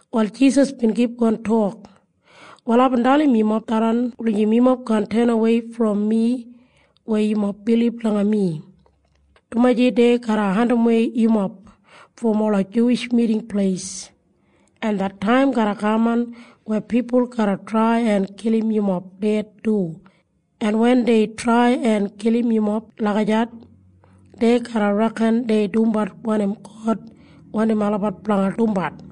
Wal Jisas bin kipgon tok, “Wal aibin dalim yumob tharran wulijim yumob kaan tenawei brom mi weya yumob bilib langa mi, dumaji dei garra andimwei yumob brom ola Juwish Miting Pleis, en det taim garra kaman weya pipul garra trai en kilim yumob ded du, en wen dei trai en kilim yumob lagijat, dei garra reken dei dumbat wanim God wandim olabat blanga dumbat.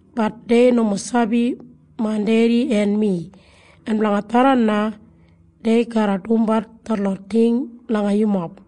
Bat dei nomo sabi main Dedi en mi. En blanga tharran na dei garra dumbat detlot ting langa yumob.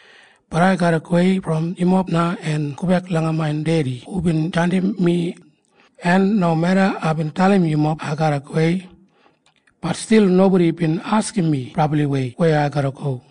Bat ai garra gowei brom yumob na en gobek langa main Dedi hubin jandim mi. En nomeda aibin dalim yumob ai garra gowei, bat stil nobodi bin askim mi brabliwei weya ai garra go.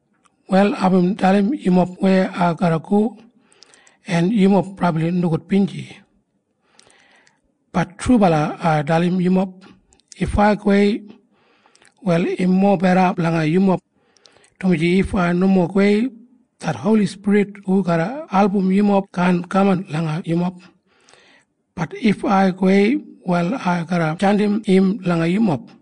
“Wal aibin dalim yumob weya ai garra go. En yumob brabli nogudbinji. Bat trubala ai dalim yumob. If ai gowei, wal im mobeda blanga yumob, dumaji if ai nomo gowei, det Holi Spirit hu garra album yumob kaan kaman langa yumob. Bat if ai gowei, wal ai garra jandim im langa yumob.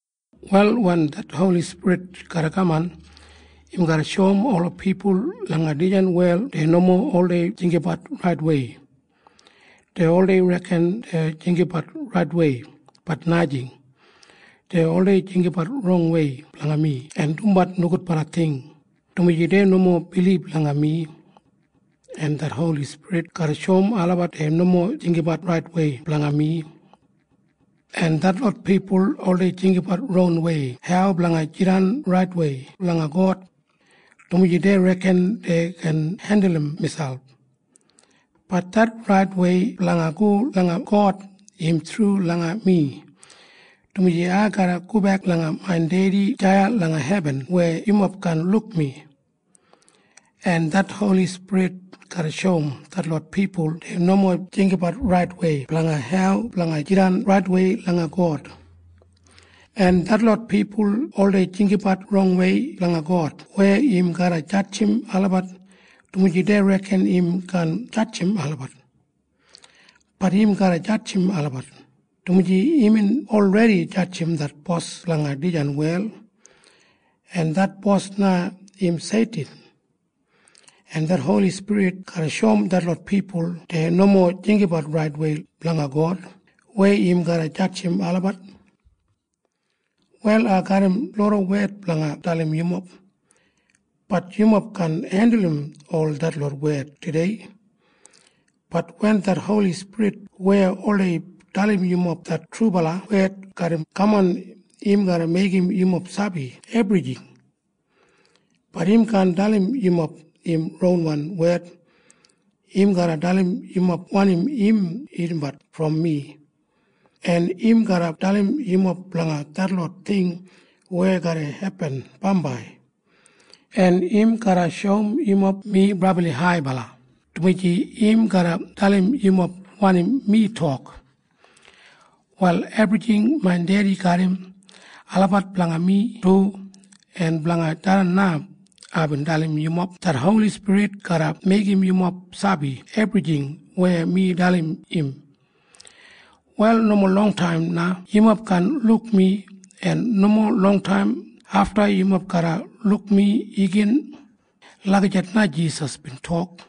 “Wal wen det Holi Spirit garra kaman, im garra shoum ola pipul langa dijan wel dei nomo oldei jinggabat raitwei. Dei oldei reken dei jinggabat raitwei. Bat najing. Dei oldei jinggabat rongwei blanga mi en dumbat nogudbala ting, dumaji dei nomo bilib langa mi. En det Holi Spirit garra shoum olabat dei nomo jinggabat raitwei blanga mi. “En detlot pipul oldei jinggabat rongwei hau blanga jidan raitwei langa God, dumaji dei reken dei gin hendulum miselp. Bat det raitwei blanga go langa God im thru langa mi, dumaji ai garra gobek langa main Dedi deya langa hebin weya yumob kaan luk mi. En det Holi Spirit garra shoum detlot pipul dei nomo jinggabat raitwei blanga hau blanga jidan raitwei langa God. “En detlot pipul oldei jinggabat rongwei blanga God weya im garra jadjim olabat, dumaji dei reken im kaan jadjim olabat. Bat im garra jadjim olabat, dumaji imbin olredi jadjim det bos blanga dijan wel. En det bos na im Seitin. En det Holi Spirit garra shoum detlot pipul dei nomo jinggabat raitwei blanga God weya im garra jadjimbat olabat. “Wal ai garram loda wed blanga dalim yumob. Bat yumob kaan hendulum ol detlot wed tudei. Bat wen det Holi Spirit weya oldei dalim yumob det trubala wed garra kaman, im garra meigim yumob sabi ebrijing. Bat im kaan dalim yumob im ronwan wed. Im garra dalim yumob wanim im irrimbat brom mi, en im garra dalim yumob blanga detlot ting weya garra hepin bambai, en im garra shoum yumob mi brabli haibala, dumaji im garra dalim yumob wanim mi tok. “Wal ebrijing main Dedi garram, olabat blanga mi du. En blanga tharran na aibin dalim yumob det Holi Spirit garra meigim yumob sabi ebrijing weya mi dalim im. “Wal nomo longtaim na yumob kaan luk mi, en nomo longtaim afta yumob garra luk mi igin.” Lagijat na Jisas bin tok.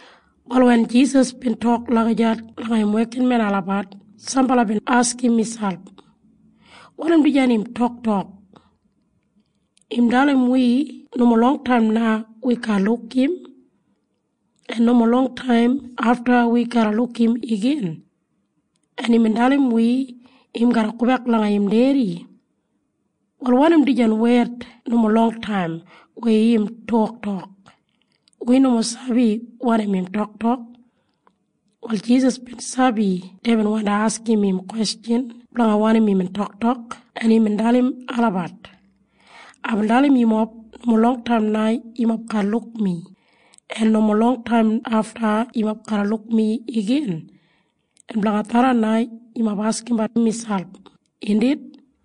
Wal wen Jisas bin tok lagijat langa im wekinmen olabat, sambala bin askim miselp, “Wanim dijan im toktok? Im dalim wi nomo longtaim na wi kaan luk im, en nomo longtaim afta wi garra luk im igin. En imbin dalim wi im garra gobek langa im Dedi. Wal wanim dijan wed nomo longtaim weya im toktok? Wi nomo sabi wanim im toktok.” Wal Jisas bin sabi deibin wandi askim im kwestjan blanga wanim imbin toktok, en imbin dalim olabat, “Aibin dalim yumob nomo longtaim na yumob kaan luk mi, en nomo longtaim afta yumob garra luk mi igin. En blanga tharran na yumob askimbat miselp, indit?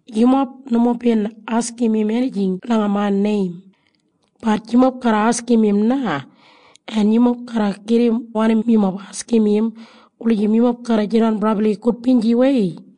Yumob nomo bin askim im enijing langa main neim. Bat yumob garra askim im na. En yumob garra gedim wanim yumob askim im wulijim yumob garra jidan brabli gudbinjiwei.”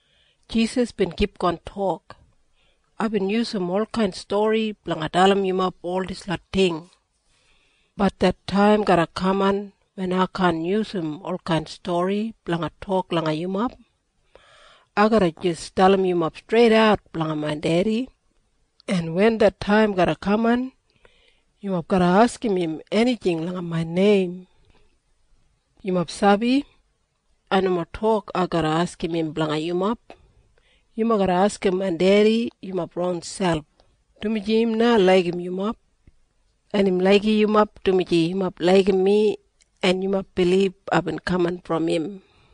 Jisas bin kipgon tok, “Aibin yusum olkain stori blanga dalim yumob ol dislot ting. Bat det taim garra kaman wen ai kaan yusum olkain stori blanga tok langa yumob. Ai garra jis dalim yumob streidat blanga main Dedi. En wen det taim garra kaman, yumob garra askim im enijing langa main neim. “Yumob sabi? Ai nomo tok ai garra askim im blanga yumob. Yumob garra askim main Dedi yumob ronselp, dumaji im na laigim yumob. En im laigim yumob dumaji yumob laigim mi en yumob bilib aibin kaman brom im.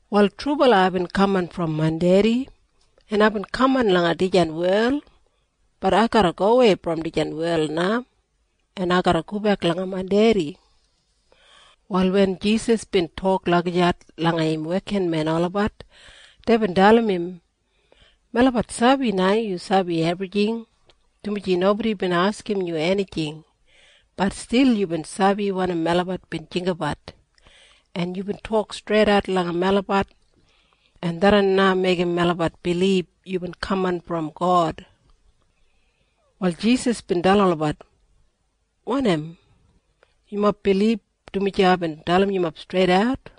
“Wal trubala aibin kaman brom main Dedi, en aibin kaman langa dijan wel. Bat ai garra gowei brom dijan wel na, en ai garra gobek langa main Dedi.” Wal wen Jisas bin tok lagijat langa im wekinmen olabat, deibin dalim im, “Melabat sabi na yu sabi ebrijing, dumaji nobodi bin askim yu enijing. Bat stil yubin sabi wanim melabat bin jinggabat, en yubin tok streidat langa melabat. En tharran na meigim melabat bilib yubin kaman brom God.” Wal Jisas bin dalim olabat, “Wanim? Yumob bilib dumaji aibin dalim yumob streidat?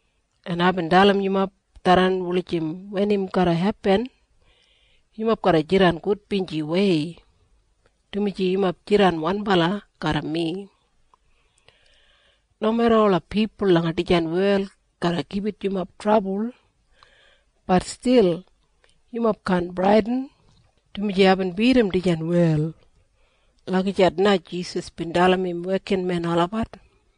En aibin dalim yumob tharran wulijim wen im garra hepin, yumob garra jidan gudbinjiwei, dumaji yumob jidan wanbala garram mi. Nomeda ola pipul langa dijan wel garra gibit yumob trabul, bat stil yumob kaan bradin, dumaji aibin bidim dijan wel.” Lagijat na Jisas bin dalim im wekinmen olabat.